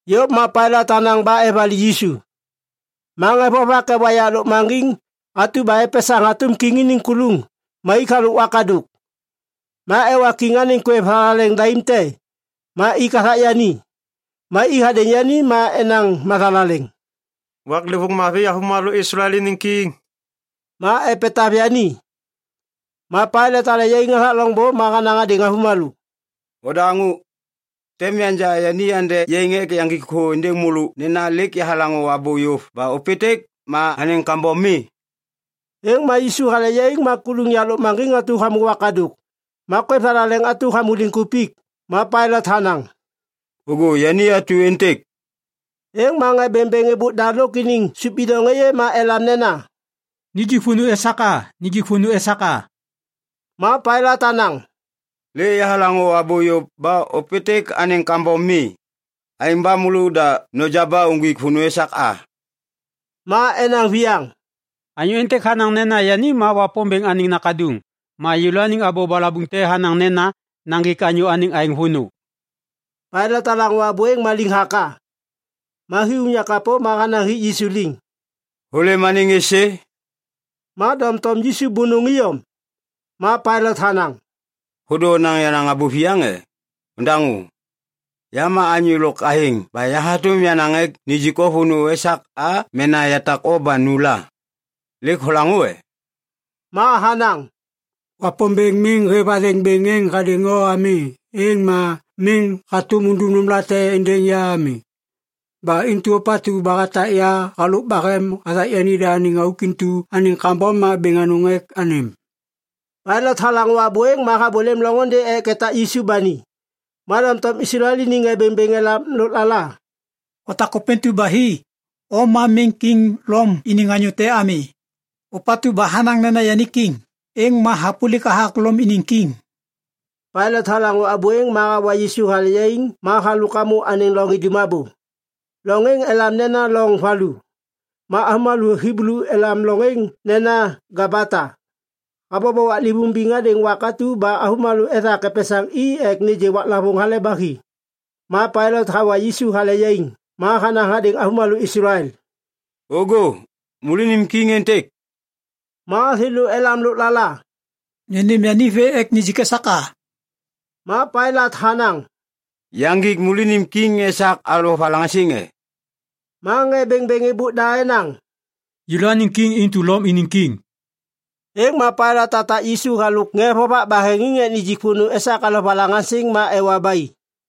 Yôv ma Pailat hanaŋ ba evali Yisu. Ma ŋê vovak ewa yak lôkmaŋgiŋ atu ba epesaŋ hatôm kiŋ iniŋ kuluŋ ma ik halôk wakadôk. Ma ewa kiŋ anêŋ kwêv thalaleŋ daim te ma ik hathak yani. Ma i hadêŋ yani ma enaŋ mathalaleŋ, “Waklêvôŋ mavi, avômalô Islael iniŋ kiŋ!” ma epetav yani. Ma Pailat hale yaiŋ hathak loŋbô ma hanaŋ hadêŋ avômalô, “Odaŋô! Tem yanja yani ende yaiŋ ek yaŋgik thô êndêŋ môlô nena lêk yahalaŋô abô yôv ba ôpêntêk ma anêŋ kambom mi.” Êŋ ma Yisu hale yaiŋ ma kuluŋ yak lôkmaŋgiŋ hamô wakadôk ma kwêv thalaleŋ atu hamô liŋkupik. Ma Pailat hanaŋ, “Ôŋgô yani atu êntêk!” Êŋ ma ŋê bêŋbêŋ êbôk da lôk iniŋ sôp bidoŋ êyê ma elam nena, “Nijik vônô esak a! Nijik vônô esak a!” Ma Pailat hanaŋ, “Lêk yahalaŋô abô yôv ba ôpêntêk anêŋ kambom mi! Aêŋ ba môlôda noja ba uŋgwik vônô esak a!” Ma enaŋ viyaŋ, “Anyô êntêk hanaŋ nena yani ma Wapômbêŋ anêŋ Nakaduŋ. Ma yêlôaniŋ abô balabuŋ te hanaŋ nena naŋgik anyô anêŋ aêŋ vônô.” Pailat halaŋô abô êŋ ba liŋhaka. Ma hi unyak kapô ma hanaŋ hik Yisu liŋ, “Hôlêm anêŋ êsê?” Ma doŋtom Yisu bônôŋ iyom. Ma Pailat hanaŋ, “Hôdô onaŋ yenaŋ abô viyaŋ e? Ondaŋô! Ya ma anyô lôk athêŋ ba ya hatôm yanaŋ ek nijik o vônô esak a mena yatak o ba nu la. Lêk holaŋô e?” Ma hanaŋ, “Wapômbêŋ miŋ hêv athêŋ bêŋ êŋ hadêŋ o ami êŋ ma miŋ hatôm undum nômlate êndêŋ ya ami. Ba intu ôpatu ba hatak ya halôk bahem hathak yanida anêŋ auk intu anêŋ kambom ma bêŋ anôŋ ek anêm.” Pailat halaŋô abô êŋ ma habôlêm loŋôndê ek etak Yisu ba ni. Ma doŋtom Islael iniŋ ŋê bêŋbêŋ elam lôklala, “Hotak ôpêntu ba hi, o ma miŋ kiŋ Lom iniŋ anyô te ami! Ôpatu ba hanaŋ nena yani kiŋ, êŋ ma hapôlik hathak Lom iniŋ kiŋ.” Pailat halaŋô abô êŋ ma hawa Yisu hale yaiŋ ma halôk hamô anêŋ loŋ idum abô. Loŋ êŋ elam nena Loŋ Valu. Ma avômalô Hiblu elam loŋ êŋ nena “Gabata”. Habobo waklêvôŋ biŋ hadêŋ wak atu ba avômalô ethak epesaŋ i ek nêgê waklavôŋ Hale ba Hi. Ma Pailat hawa Yisu hale yaiŋ ma hanaŋ hadêŋ avômalô Islael, “Ôŋgô, môlônim kiŋ êntêk.” Ma thêlô elam lôklala, “Nônêm yani vê ek nijik esak a!” Ma Pailat hanaŋ, “Yaŋgik môlônim kiŋ esak alovalaŋaŋsiŋ e?” Ma ŋê bêŋbêŋ êbôk da enaŋ, “Yêlôaniŋ kiŋ intu Lom iniŋ kiŋ!” Êŋ ma Pailat hatak Yisu halôk ŋê vovak baheŋiŋ ek nijik vônô esak alovalaŋaŋsiŋ ma ewa ba i.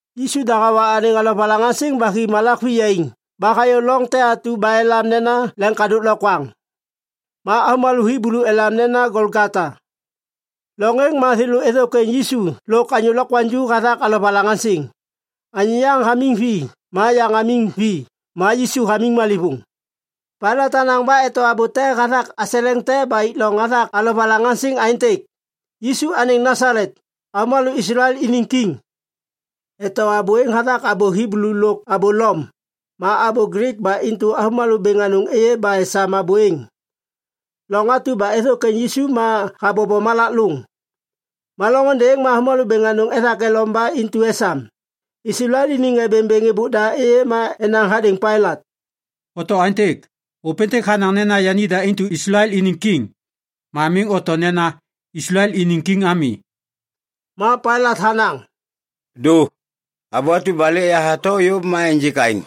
Yisu da hawa anêŋ alovalaŋaŋsiŋ ba hi malak viyaiŋ ba hayô loŋ te atu ba elam nena Leŋkadôk Lokwaŋ. Ma avômalô Hiblu elam nena Golgota. Loŋ êŋ ma thêlô êthôkwêŋ Yisu lôk anyô lokwaŋju hathak alovalaŋaŋsiŋ. Anyô yaŋ hamiŋ vi ma yaŋ hamiŋ vi ma Yisu hamiŋ malêvôŋ. Pailat hanaŋ ba eto abô te hathak aseleŋ te ba ik loŋ hathak alovalaŋaŋsiŋ aêntêk, YISU ANÊŊ NASALET, AVÔMALÔ ISLAEL INIŊ KIŊ Eto abô êŋ hathak abô Hiblu lôk abô Lom, ma abô Glik ba intu avômalô bêŋ anôŋ êyê ba esam abô êŋ. Loŋ atu ba êthôkwêŋ Yisu ma habobo malak lôŋ. Ma loŋôndê êŋ ma avômalô bêŋ anôŋ ethak elom ba intu esam. Islael iniŋ ŋê bêŋbêŋ êbôk da êyê ma enaŋ hadêŋ Pailat, “Oto aêntêk, ‘Ôpêntêk hanaŋ nena yanida intu Islael iniŋ kiŋ.’ Ma miŋ oto nena, ‘Islael iniŋ kiŋ’ ami.” Ma Pailat hanaŋ, “Dô, abô atu ba lêk yahato yôv ma ênjêk aêŋ.”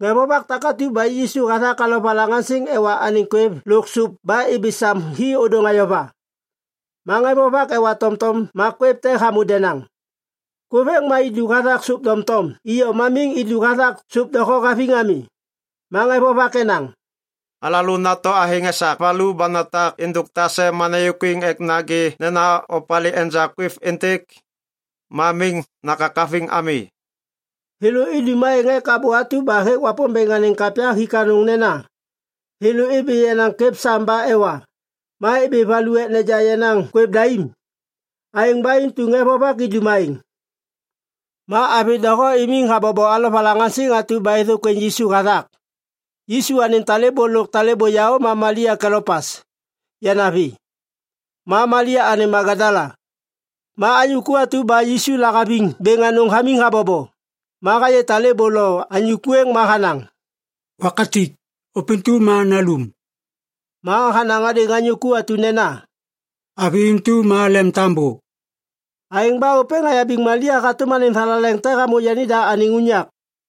Ŋê vovak takatu ba ik Yisu hathak alovalaŋaŋsiŋ ewa anêŋ kwêv lôk sôp ba ibi sam hi ôdôŋ ayova. Ma ŋê vovak ewa tomtom ma kwêv te hamô denaŋ. Kwêv êŋ ma idu hathak sôp doŋtom iyom ma miŋ idu hathak sôp doho haviŋ ami. Ma ŋê vovak enaŋ, “Alalô nato athêŋ esak valu ba natak êndôk tase ma nayôkwiŋ ek nagê nena opalê enja kwêv êntêk. Ma miŋ nakakaviŋ ami.” Thêlô idum aêŋ ek abô atu ba hêk Wapômbêŋ anêŋ kapya hik anôŋ nena, “Thêlô ibi yenaŋ kwêv sam ba ewa, ma ibi valu ek neja yenaŋ kwêv daim.” Aêŋ ba intu ŋê vovak idum aêŋ. Ma avi doho imiŋ habobo alovalaŋaŋsiŋ atu ba êthôkwêŋ Yisu hathak. Yisu anêŋ talêbô lôk talêbô yaô ma Malia Kelopas yanavi, ma Malia anêŋ Magadala. Ma anyô ku atu ba Yisu lahaviŋ bêŋ anôŋ hamiŋ habobo. Ma hayê talêbô lo anyô ku êŋ ma hanaŋ, “Wakatik, ôpêntu ma nalum.” Ma hanaŋ hadêŋ anyô ku atu nena, “Avi intu ma lemtambô.” Aêŋ ba ôpêŋ hayabiŋ Malia hatôm anêŋ thalaleŋ te hamô yanida anêŋ unyak.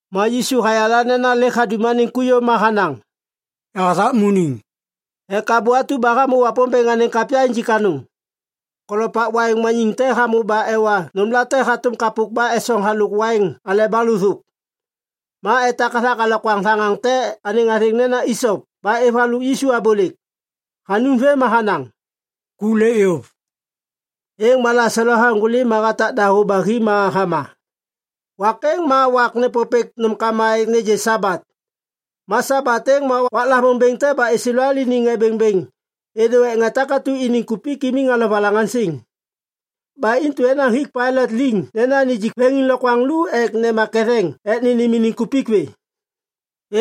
Ma Yisu hayala nena lêk hadum anêŋ ku yôv ma hanaŋ, “Yahathakmuniŋ” ek abô atu ba hamô Wapômbêŋ anêŋ kapya injik anôŋ. Kolopak waiŋ maniŋ te hamô ba ewa nômlate hatôm kapôk ba esoŋ halôk waiŋ aleba lôthôk. Ma etak hathak alokwaŋ thaŋaŋ te anêŋ athêŋ nena “isop” ba êv halôk Yisu abôlêk. Hanum vêm ma hanaŋ, “Ku lêk yôv.” Êŋ ma laselo haŋgôli ma hatak dahô ba hi ma hama. Wak êŋ ma wak nêpôpêk nômkama ek nêgê Sabat. Ma Sabat êŋ ma waklavôŋ bêŋ te ba Islael iniŋ ŋê bêŋbêŋ êdô ek ŋê takatu iniŋ kupik imiŋ alovalaŋaŋsiŋ. Ba intu enaŋ hik Pailat liŋ nena nijik veŋiŋlokwaŋ lu ek nema ketheŋ ek nênêm iniŋ kupik vê.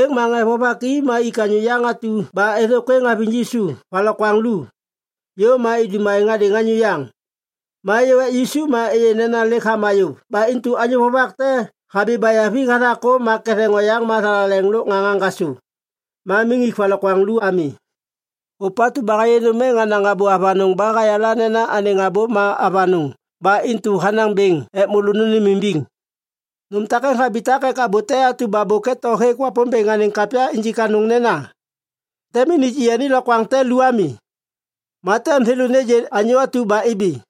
Êŋ ma ŋê vovak i ma ik anyô yaŋ atu ba êthôkwêŋ haviŋ Yisu valokwaŋ lu. Yôv ma idum aêŋ hadêŋ anyô yaŋ. Ma êyô ek Yisu ma êyê nena lêk hama yôv ba intu anyô vovak te habi bayavi hathak kôm ma ketheŋ oyaŋ ma thalaleŋ lôk ŋaŋ haŋgasô. Ma miŋ ik valokwaŋ lu ami. Ôpatu ba hayê nôm êŋ hanaŋ abô avanôŋ ba hayala nena anêŋ abô ma avanôŋ ba intu hanaŋ bêŋ ek môlô nônêmimbiŋ. Nôm takêŋ habitak ek abô te atu ba bôk hêk Wapômbêŋ anêŋ kapya injik anôŋ nena, “Tem miŋ nijik yani lokwaŋ te lu ami.” Ma “Tem thêlô nêgê anyô atu ba ibi.”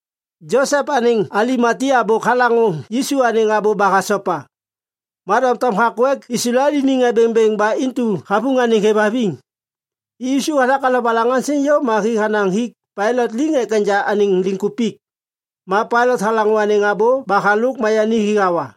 Josep anêŋ Alimatia bôk halaŋô Yisu anêŋ abô ba hasopa. Ma doŋtom hakô ek Islael iniŋ ŋê bêŋbêŋ ba intu havuŋ anêŋ hêvhaviŋ. Ik Yisu hathak alovalaŋaŋsiŋ yôv ma hi hanaŋ hik Pailat liŋ ek enja anêŋ liŋkupik. Ma Pailat halaŋô anêŋ abô ba halôk ma yani hi hawa.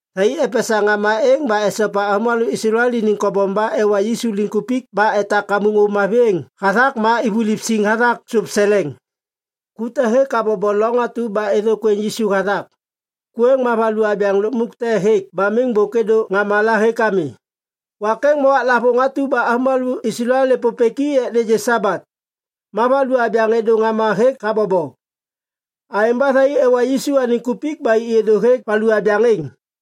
Thai epesaŋ ŋama êŋ ba esopa avômalô Islael iniŋ kobom ba ewa Yisu liŋkupik ba etak kamuŋ ôv mavi êŋ hathak ma ivuliv siŋ hathak sôp seleŋ. Ku te hêk habobo loŋ atu ba êthôkwêŋ Yisu hathak. Ku êŋ ma valu abyaŋ lukmuk te hêk ba miŋ bôk êdô ŋama la hêk ami. Wak êŋ ma waklavôŋ atu ba avômalô Islael nêpôpêk i ek nêgê Sabat. Ma valu abyaŋ êdô ŋama hêk habobo. Aêŋ ba thai ewa Yisu anêŋ kupik ba i êdô hêk valu abyaŋ êŋ.